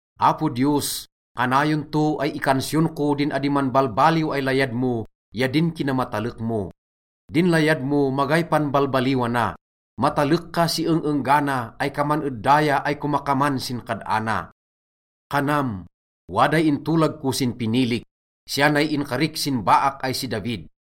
Apo Diyos, kanayon to ay ikansiyon ko din adi manbalbaliw ay layad mo ya din kinamatalek mo. Din layad mo, magay panbalbaliwana. Matalek ka si eng-enggana ay kaman ed daya ay komakaman sin kad-ana. Kanam, “Waday intolag ko sin pinilik, siya nay inkarik sin baak ay si David: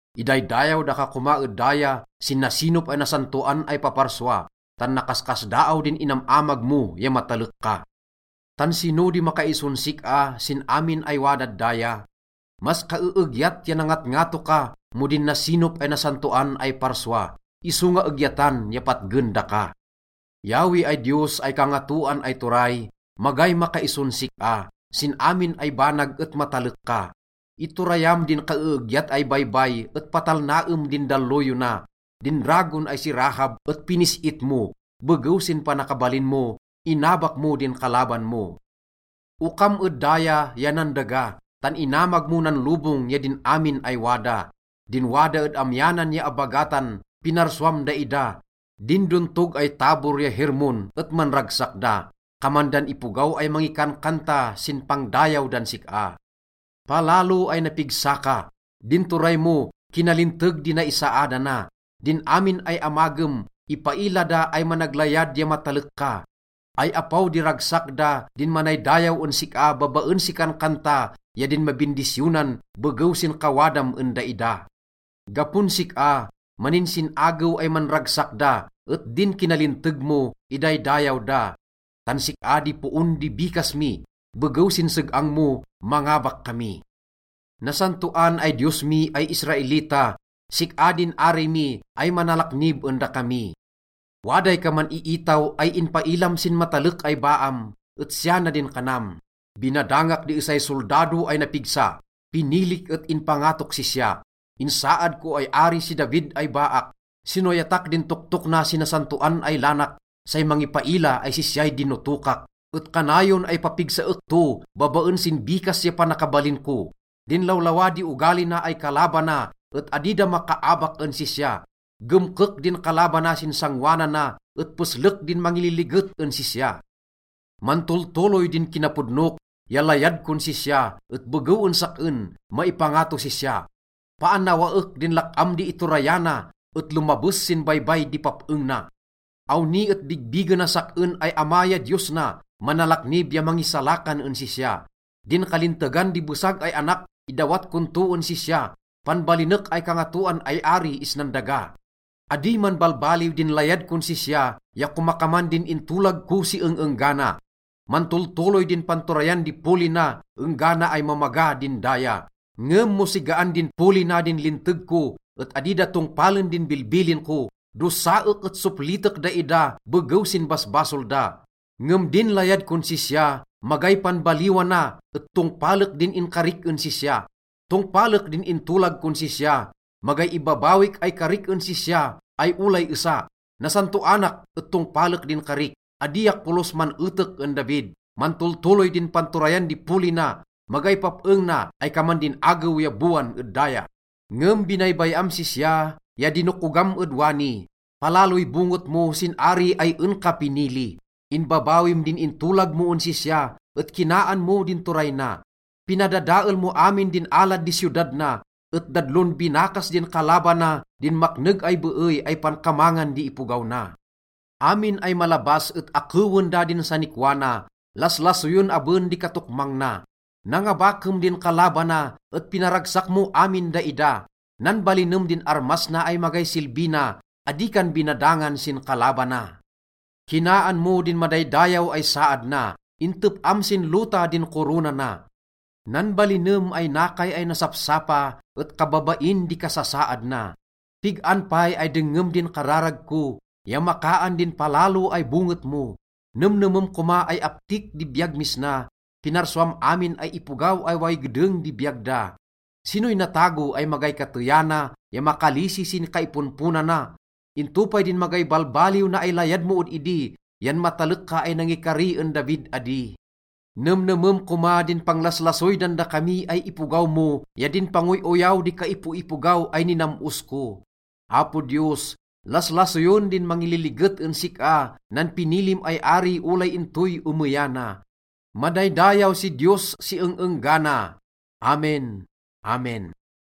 Idaydayaw daka koma ed daya sin nasinop ay nasantoan ay paparsua, tan nakaskasdaaw din inam-amag mo ya matalek ka. Tan sino di makaison sik-a sin amin ay wadad daya? Mas kaeegyat ya nangatngato ka mo din nasinop ay nasantoan ay parsua, isonga egyatan ya patgen daka. Yahweh ay Diyos ay Kangatoan ay Turay, magay makaison sik-a. Sin amin ay banag et matalek ka. Iturayam din kaeegyat ay baybay et patalnaem din dalloyona. Din dragon ay si Rahab et pinis-it mo. Begew sin panakabalin mo, inabak mo din kalaban mo. Okam ed daya ya nan daga, tan inamag mo nan lobong ya din amin ay wada. Din wada ed amyanan ya abagatan, pinarsuam daida. Din dontog ay Tabor ya Hermon et manragsak da. Kaman dan ipogaw ay mangikankanta sin pangdayaw dan sik-a. Palalo ay napigsa ka. Din turay mo, kinalinteg di naisaadana. Din amin ay amagem, ipaila da ay managlayad ya matalek ka. Ay apaw di ragsak da din manaydayaw en sik-a babaen si kankanta ya din mabindisyonan begew sin kawadam en daida. Gapon sik-a, maninsin-agew ay manragsak da, et din kinalinteg mo, idaydayaw da. Tan sik-a di poon di bikas mi, begew sin seg-ang mo, mangabak kami. Nasantoan ay Diyos mi ay Israelita, sik-a din ari mi ay manalaknib en dakami. Waday kaman iitaw ay inpailam sin matalek ay baam, et siya na din kanam, “Binadangak di esay soldado ay napigsa, pinilik et inpangatok sisya. Insaad ko ay ari si David ay baak. Sinoyatak din toktok na sin nasantoan ay lanak, say mangipaila ay sisyay dinotokak. Et kanayon ay papigsaek to babaen sin bikas ya panakabalin ko. Din lawlawa di ogali na ay kalabana et adi da makaabak en sisya. Gemkek din kalabana sin sangoanana et peslek din mangililiget en sisya. Mantoltoloy din kinapodnok ya layad kon sisya et begew en sak-en, maipangatos sisya. Paannawaek din lak-am di iturayana et lomabes sin baybay di pap-eng na. Awni et bigbigenas sak-en ay Ama ya Diyos na, manalaknib ya mangisalakan en sisya. Din kalintegan di besag ay anak, idawat kon to en sisya. Panbalinek ay kangatoan ay ari isnan daga. Adi manbalbaliw din layad kon sisya, ya komakaman din intolag ko si eng-enggana. Mantoltoloy din panturayan di poli na enggana ay mamaga din daya. Ngem mo sigaan din poli na din linteg ko et adi da tongpalen din bilbilin ko, dosaek et soplitek daida begew sin basbasol da. Ngem din layad kon sisya, magay panbaliwana et tongpalek din inkarik en sisya. Tongpalek din intolag kon sisya, magay ibabawik ay karik en sisya, ay olay esa. Nasantoanak et tongpalek din karik. Adiak polos man-etek en David. Mantoltoloy din panturayan di poli na, magay pap-eng na ay kaman din agew ya bowan ed daya.” Ngem binaybay-am sisya ya dinokogam ed wani. Palaloy bonget mo sin ari ay en ka pinili. Inbabawim din intolag mo en sisya et kinaan mo din turay na. Pinadadael mo amin din alad di siyodad na, et dadlon binakas din kalabana din makneg ay beey ay pankamangan di ipogaw na. Amin ay malabas et akewen da din sanikwa na. Laslasoyen aben di katokmang na. Nangabakem din kalabana et pinaragsak mo amin daida. Nanbalinem din armas na ay magay silbi na, adi kan binadangan sin kalabana. Kinaan mo din madaydayaw ay saad na, intep-am sin lota din korona na. Nanbalinem ay nakay ay nasapsapa et kababain di kasasaad na. Pig-an pay ay dengngem din kararag ko ya makaan din palalo ay bonget mo? Nemnemem koma ay aptik di biyag mis na, pinarsuam amin ay ipogaw ay way gedeng di biyag da. Sinoy natago ay magay kateyana ya makalisi sin kaiponponana. Into pay din magay balbaliw na ay layad mo ed idi yan matalek ka ay nangikari en David adi? Nemnemem koma din panglaslasoy dan dakami ay ipogaw mo ya din pangoy-oyaw di kaipoipogaw ay ninam-os ko. Apo Diyos, laslasoyen din mangiliget en sik-a nan pinilim ay ari olay intoy emeyana. Madaydayaw si Diyos si eng-enggana. Amen! Amen!